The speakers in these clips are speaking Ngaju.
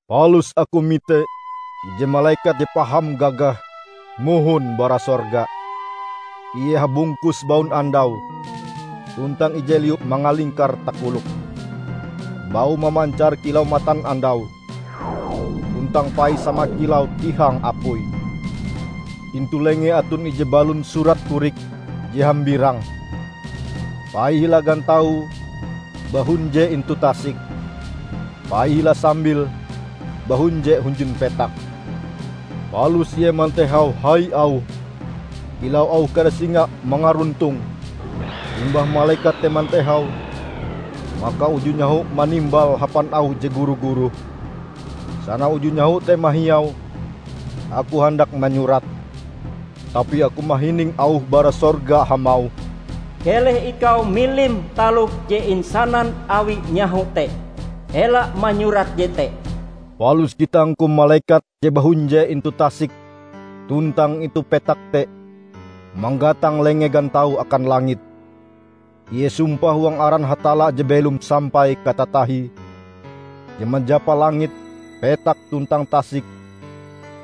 Palus aku mite ije malekat je paham gagah mohon bara sorga. Ie habungkus baunandau, tuntang ije liu mangalingkar takoloke. Baue mamancar kilau matanandau, tuntang paie sama kilau tihang apui. Intu lengee aton ije balon surat korik je hambirang. Paie hila gantaue bahunje intu tasik, paie hila sambil bahunje hunjun petak. Palus ie mantehau hai auhe kilau auh kare singa mangaruntong. Limbah malekat te mantehau, maka uju nyaho manimbale hapan auh je guru-guruh. Sana uju nyaho te mahiau, aku handak manyurate, tapi aku mahining auh bara sorga hamauh, "Keleh ikau milim taloh je insanan awi nyaho te; ela manyurat jete!" Palus gitangku malekat je bahunje intu tasik tuntang intu petak te manggatang lenge gantaue akan langit. Ie sumpah huang aran Hatalla je belom sampai katatahie, je manjapa langit, petak tuntang tasik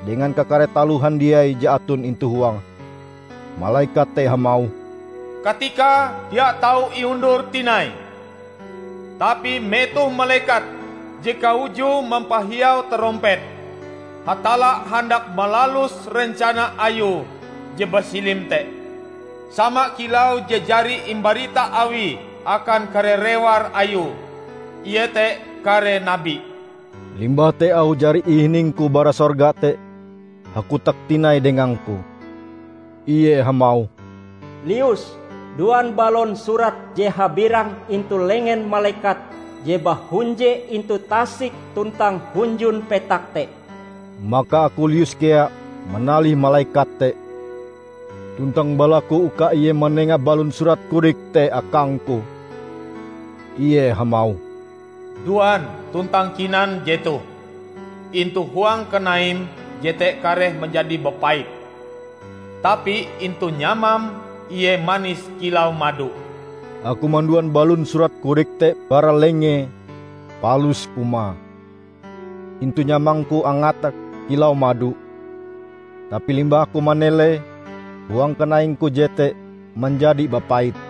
dengan kakare taloh handiai je aton intu huange. Malekat te hamauh, "Katikae dia tau iundur tinai! Tapi metoh malekat je kaujue mampahiau tarompete, Hatalla handak malalus rencana Ayue je basilim te, sama kilau je jari imbarita Awie akan kare rewar Ayue, iete kare nabi." Limbah te auh jari ihiningku bara sorga te, hakotak tinai dengangku. Ie hamauh, "Lius, duan balon surat je habirang intu lengen malekat je bahunje intu tasik tuntang hunjun petak te." Maka aku lius kea manalih malekat te tuntang balaku uka ie manenga balon surat korik te akangku. Ie hamauh, "Duan tuntang kinan jetoh. Intu huang kanaim jete kareh manjadi bapait, tapi intu nyamam ie manis kilau mado." Aku manduan balon surat korik te bara lengee palus kumae. Intu nyamangku angate kilau mado, tapi limbah aku manelee, huang kanaingku jete manjadi bapait.